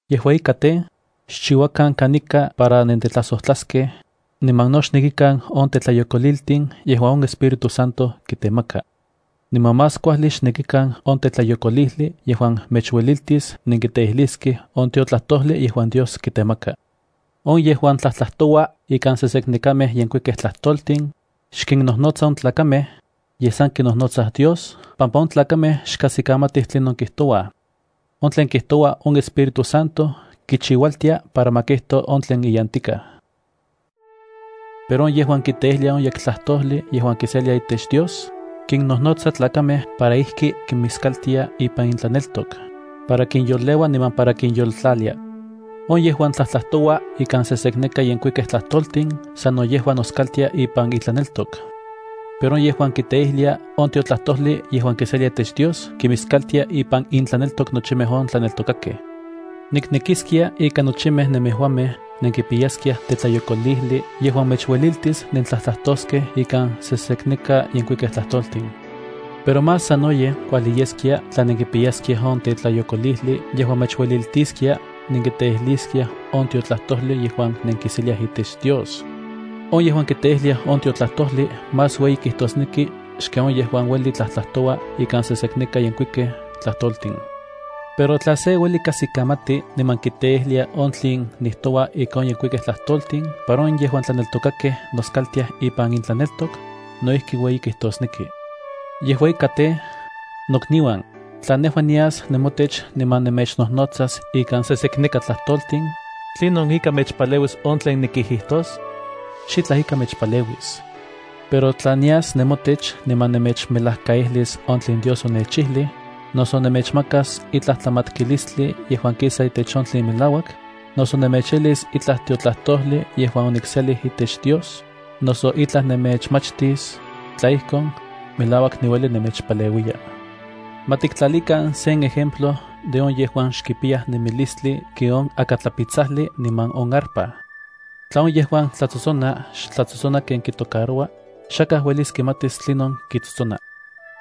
Yejua ika, xchiuakan kanika para nentetlajsojtlaskej, niman no xnekikan on tetlayokoliltin yejuan on Espíritu Santo kitemaka. Niman más kuajli xnekikan on tetlayokolijli yejuan mechueliltis nenkiteijliskej on tiotlajtojli yejuan Dios kitemaka. On yejuan tlajtlajtoua ikan seseknekamej yenkuikej tlajtoltin, xkinnojnotsa on tlakamej, yej san kinojnotsa Dios, pampa on tlakamej xkajsikamatij tlinon kijtoua. On tlen kijtoua, on Espíritu Santo kichiualtia para ma kijito on tlen iyantikaj. Pero on yejuan kiteijlia on yektlajtojli yejuan kiselia itech Dios, kinnojnotsa tlakamej para ijki kimiskaltia ipan intlaneltok, para kinyoleua niman para kinyoltlalia. On yejuan tlajtlajtoua ikan sesekneka yenkuikej tlajtoltin sano yejua noskaltia ipan itlaneltok. Pero on yejuan kiteijlia on tiotlajtojli yejuan kiselia itech Dios kimiskaltia ipan intlaneltok nochimej on tlaneltokakej. Niknekiskia ika nochimej nemejuamej nenkipiyaskiaj tetlayokolijli yejuan mechueliltis nentlajtlajtoskej ikan seseneka yenkuikej tlajtoltin. Pero más sanoyej kuajli yeskia tla nenkipiyaskiaj on tetlayokolijli yejuan mechueliltiskia nenkiteijliskiaj on tiotlajtojli yejuan nenkiseliaj itech Dios. On yejuan kiteijlia on tiotlajtojli más ueyi kijtosneki xken on yejuan ueli tlajtlajtoua ikan seseneka yenkuikej tlajtoltin. Pero tla se ueli kajsikamati niman kiteijlia on tlen nijtoua ikan on yenkuikej tlajtoltin para on yejuan tlaneltokakej noskaltiaj ipan intlaneltok, no ijki ueyi kijtosneki. Yejua ika tej, nokniuan, tla nejua nias nemotech niman nemechnojnotsas ikan seseka tlajtoltin, ¿tlinon ika mechpaleuis on tlen nikijijtos? Xitlaj ika mechpaleuis. Pero tla nias nemotech niman nemechmelajkaijlis on tlen Dios onechijlij, noso nemechmakas itlaj tlamatkilistli yejuan kisa itech on tlen melauak, noso nemechijlis itlaj tiotlajtojli yejuan onikselij itech Dios, noso itlaj nemechmachtis, tla ijkon, melauak niueli nemechpaleuiya. Ma tiktlalikan sen ejemplo de on yejuan xkipiyaj nemilistli ken on akatlapitsajli niman on arpa. Tla on yejuan tlatsotsona xtlatsotsona ken kitocaroua, xakaj uelis kimatis tlinon kitsotsona.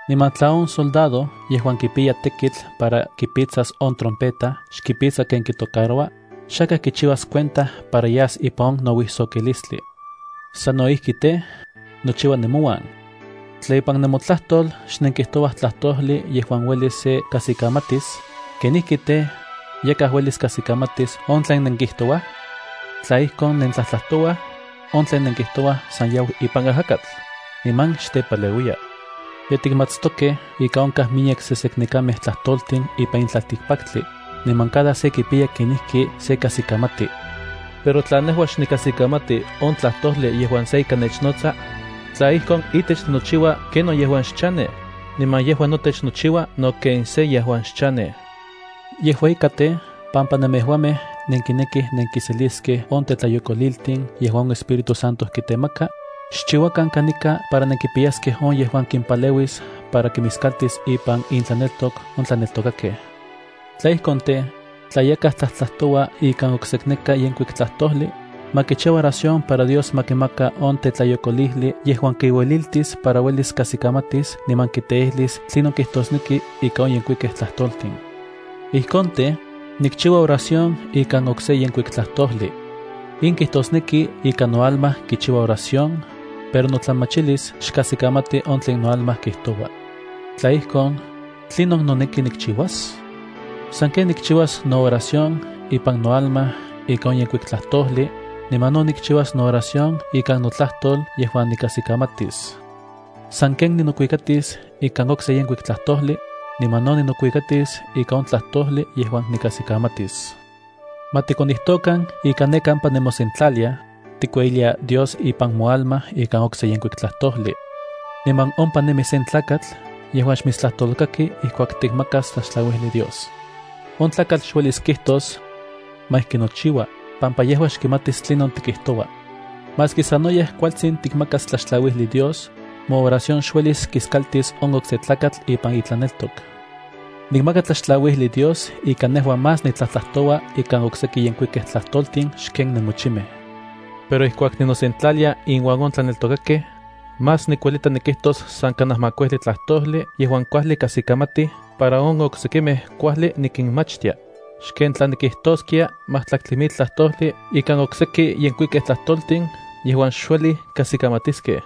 Niman tla on soldado yejuan kipiya tekitl para kipitsas on trompeta xkipitsa ken kitocaroua, xakaj kichiuas cuenta para yas ipan on nouijsokilistli. Sano ijki tej, nochiua nemouan. Tla ipan nemotlajtol xnenkijtouaj tlajtojli yejuan uelis se kajsikamatis, ¿kenijki tej, yakaj uelis kajsikamatis on tlen nenkijtouaj? Tla ijkon nentlajtlajtouaj, on tlen nenkijtouaj san yau ipan ajakatl, niman xtepaleuiya. Ye tikmatstokej ika onkaj miyek seseknekamej tlajtoltin ipan in tlaltikpaktli, niman cada se kipiya kenijki se kajsikamati. Pero tla nejua xnikajsikamati on tlajtojli yejuan se ika nechnotsa, tla ijkon itech ninochiua ken on yejuan xchanej, niman yejua notech nochiua no ken se yejuan xchanej. Yejua ika tej, pampa nemejuamej nenkinekij nenkiseliskej on tetlayokoliltin yejuan on Espíritu Santo kitemaka, xchiuakan kanika para nenkipiyaskej on yejuan kimpaleuis para kimiskaltis ipan intlaneltok on tlaneltokakej. Tla ijkon tej, tla yakaj tlajtlajtoua ikan oksekneka yenkuik tlajtojli, ma kichiua oración para Dios ma kimaka on tetlayokolijli yejuan kiueliltis para uelis kajsikamatis niman kiteijlis tlinon kijtosnek ika on yenkuikej tlajtoltin. Ijkon tej, nikchiua oración ikan okse yenkuik tlajtojli. In kijtosneki ika noalma kichiua oración, pero notlamachilis xkajsikamati on tlen noalma kijtoua. Tla ijkon, ¿tlinon noneki nikchiuas? Sanken nikchiuas nooración ipan noalma ika on yenkuik tlajtojli, niman no nikchiuas nooración ikan notlajtol yejuan nikajsikamatis. Sanken ninokuikatis ikan okse yenkuik tlajtojli, niman no ninokuikatis ikan on tlajtojli yejuan nikajsikamatis. Ma tikonijtokan ika ne kampa nemosentlaliaj, tikueyilia Dios ipan moalma ikan okse yenkuik tlajtojli. Niman ompa nemi sen tlakatl yejuan xmitstlajtolkaki ijkuak tikmakas tlaxtlauijli Dios. On tlakatl xuelis kijtos: “Ma ijki nochiua”, pampa yejua xkimatis tlinon tikijtoua. Maski sanoyej kualtsin tikmakas tlaxtlauijli Dios, mooración xuelis kiskaltis on okse tlakatl ipan itlaneltok. Nikmaka tlaxtlauijli Dios ika nejua más nitlajtlajtoua ikan okseki yenkuikej tlajtoltin xken nemochimej. Pero ijkuak ninosentlalia inuan on tlaneltokakej, más nikuelita nikijtos san kanaj makuijli tlajtojli yejuan kuajli kajsikamatij para on oksekimej kuajli nikinmachtia, xken tla nikijtoskia majtlaktli mil tlajtojli ikan okseki yenkuikej tlajtoltin yejuan xuelij kajsikamatiskej.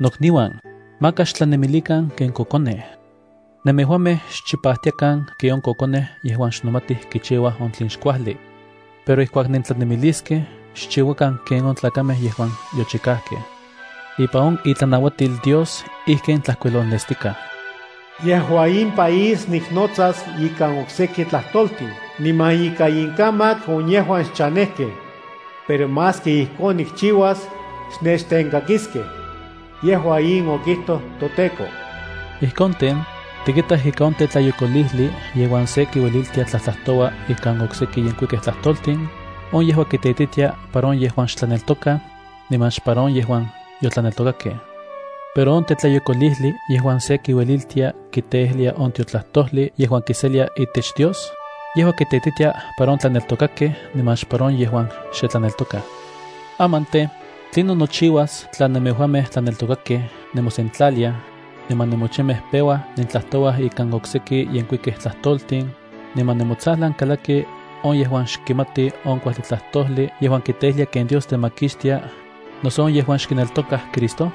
Nokniuan, maka xtlanemilikan ken kokonej. Nemejuamej xchipajtiakan ken on kokonej yejuan xnomatij kichiuaj on tlen xkuajli. Pero ijkuak nentlanemiliskej, xchiuakan ken on tlakamej yejuan yochikajkej. Ipan on itlanauatil Dios ijkin tlajkuilolnestikaj: “Yejua in país niknotsas ikan okseki tlajtoltin niman ika inkamak on yejuan xchanejkej. Pero maski ijkon nikchiuas, xnechtenkakiskej. Yejua in okijtoj toTEKO.” Ijkon tej, tikitaj ika on tetlayokolijli yejuan se kiueliltia tlajtlajtoua ikan okseki yenkuikej tlajtoltin, on yejua kiteititia para on yejuan xe tlaneltokaj, niman xpara on yejuan yotlaneltokakej. Pero on tetlayokolijli yejuan se kiueliltia kiteijlia on tiotlajtojli yejuan kiselia itech Dios, yejua kiteititia para on tlaneltokakej niman xpara on yejuan xe tlaneltokaj. Aman tej, ¿tlinon nochiuas tla nemejuamej tlaneltokakej nemosentlaliaj, niman nemochimej peua nentlajtouaj ikan okseki yenkuikej tlajtoltin, niman nemotsajlan kalakij on yejuan xkimatij on kuajli tlajtojli yejuan kiteijlia ken Dios temakixtia, noso on yejuan xkineltokaj Cristo?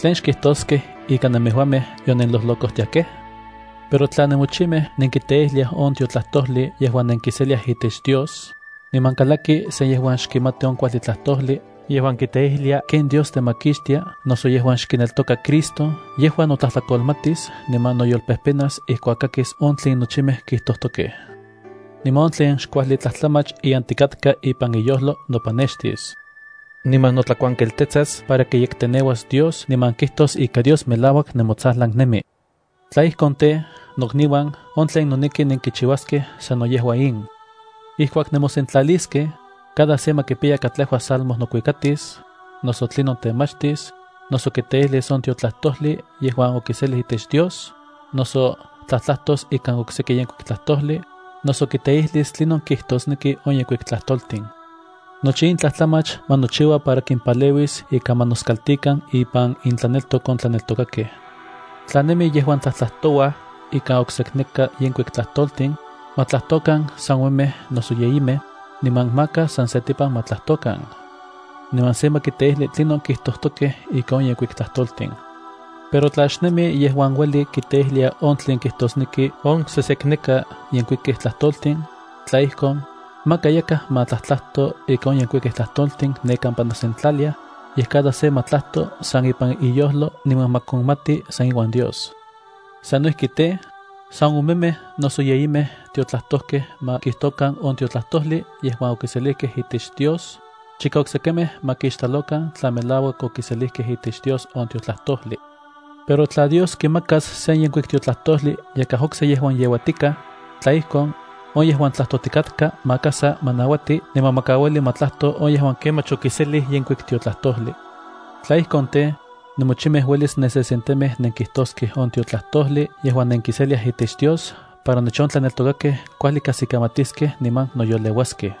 ¿Tlen xkijtoskej ika nemejuamej yonenlojlocojtiakej? Pero tla nemochimej nenkiteijliaj on tiotlajtojli yejuan nenkiseliaj itech Dios, niman kalaki se yejuan xkimati on kuajli tlajtojli yejuan kiteijlia ken Dios temakixtia, noso yejuan xkineltoka Cristo, yejua notlajtlakolmatis niman noyolpejpenas ijkuak kakis on tlen nochimej kijtojtokej. Niman on tlen xkuajli tlajtlamach iyantikatka ipan iyojlo nopanextis. Niman notlakuantelketsas para kiyekteneuas Dios niman kijtos ika Dios melauak nemotsajlan nemi. Tla ijkon tej, nokniuan, on tlen noneki nenkichiuaskej sano yejua in. Ijkuak nemosentlaliskej, cada se ma kipiya kajtlejua salmo nokuikatis, noso tlinon temachtis, noso kiteijlis on tiotlajtojli yejuan okiselij itech Dios, noso tlajtlajtos ikan okseki yenkuik tlajtojli, noso kiteijlis tlinon kijtosneki on yenkuik tlajtoltin. Nochi in tlajtlamach ma nochiua para kimpaleuis ika ma noskaltikan ipan intlaneltok on tlaneltokakej. Tla nemij yejuan tlajtlajtouaj ikan oksekneka yenkuik tlajtoltin, ma tlajtokan san omemej noso yeyimej, niman maka san setipan ma tlajtokan. Niman se ma kiteijli tlinon kijtojtokej ika on yenkuikej tlajtoltin. Pero tla xnemi yejuan ueli kiteijlia on tlen kijtosneki on sejsekneka yenkuikej tlajtoltin, tla ijkon, maka yakaj ma tlajtlajto ika on yenkuikej tlajtoltin ne kampa nosentlaliaj, yej cada se ma tlajto san ipan iyojlo niman ma konmati san iuan Dios. Sano ijki tej, san omemej noso yeyimej tiotlajtojkej ma kijtokan on tiotlajtojli yejuan okiselijkej itech Dios, chika oksekimej ma kixtlalokan tla melauak okiselijkej itech Dios on tiotlajtojli. Pero tla Dios kimakas sen yenkuik tiotlajtojli yakaj okse yejuan yeuatikaj, tla ijkon, on yejuan tlajtojtikatka maka sa ma nauati niman ma kauili ma tlajto on yejuan kemach okiselij yenkuik tiotlajtojli. Tla ijkon tej, nemochimej uelis nensesentemej nenkijtoskej on tiotlajtojli yejuan nenkiseliaj itech Dios para nochi on tlaneltokakej kuajli kajsikamatstiaskej niman noyoleuaskej.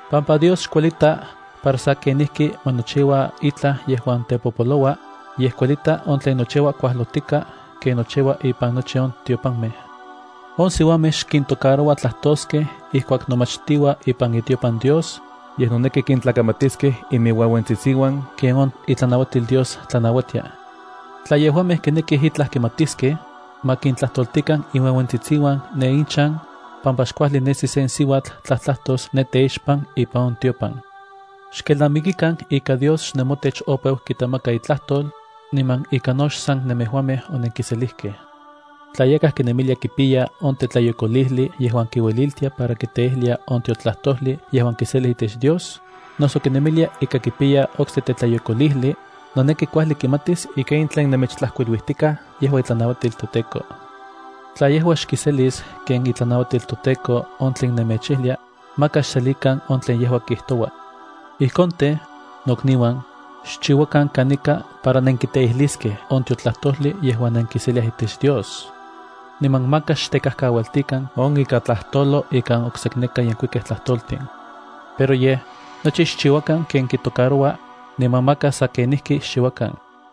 pampa Dios xkuelita para sa kenijki ma nochiua itlaj yejuan tepopoloua, yej kuelita on tlen nochiua kuajlotika ken nochiua ipan nochi on tiopanmej. On siuamej xkintocaroua tlajtoskej ijkuak nomachtiua ipan itiopan Dios, yej noneki kintlakamatiskej iminueuentsitsiuan ken on itlanauatil Dios tlanauatia. Tla yejuamej kinekij itlaj kimatiskej, ma kintlajtoltikan inueuentsitsiuan ne inchan, pampa xkuajli nesi sen siuatl tlajtlajtos ne teixpan ipan on tiopan. Xkelnamikikan ika Dios xnemotech opeu kitemaka itlajtol, niman ika no xsan nemejuamej onenkiselijkej. Tla yakaj kinemilia kipiya on tetlayokolijli yejuan kiueliltia para kiteijlia on tiotlajtojli yejuan kiselia itech Dios, noso kinemilia ika kipiya okse tetlayokolijli, noneki kuajli kimatis ika in tlen nemechtlajkuiluijtikaj yejua itlanauatil toTEKO. Tla yejua xkiselis ken itlanauatil toTEKO on tlen nemechijlia, maka xselikan on tlen yejua kijtoua. Ijkon tej, nokniuan, xchiuakan kanika para nenkiteijliskej on tiotlajtojli yejuan nenkiseliaj itech Dios. Niman maka xtekajkaualtikan on ika tlajtolo ikan oksekneka yenkuikej tlajtoltin. Pero yej, nochi xchiuakan ken kitocaroua, niman maka sa kenijki xchiuakan.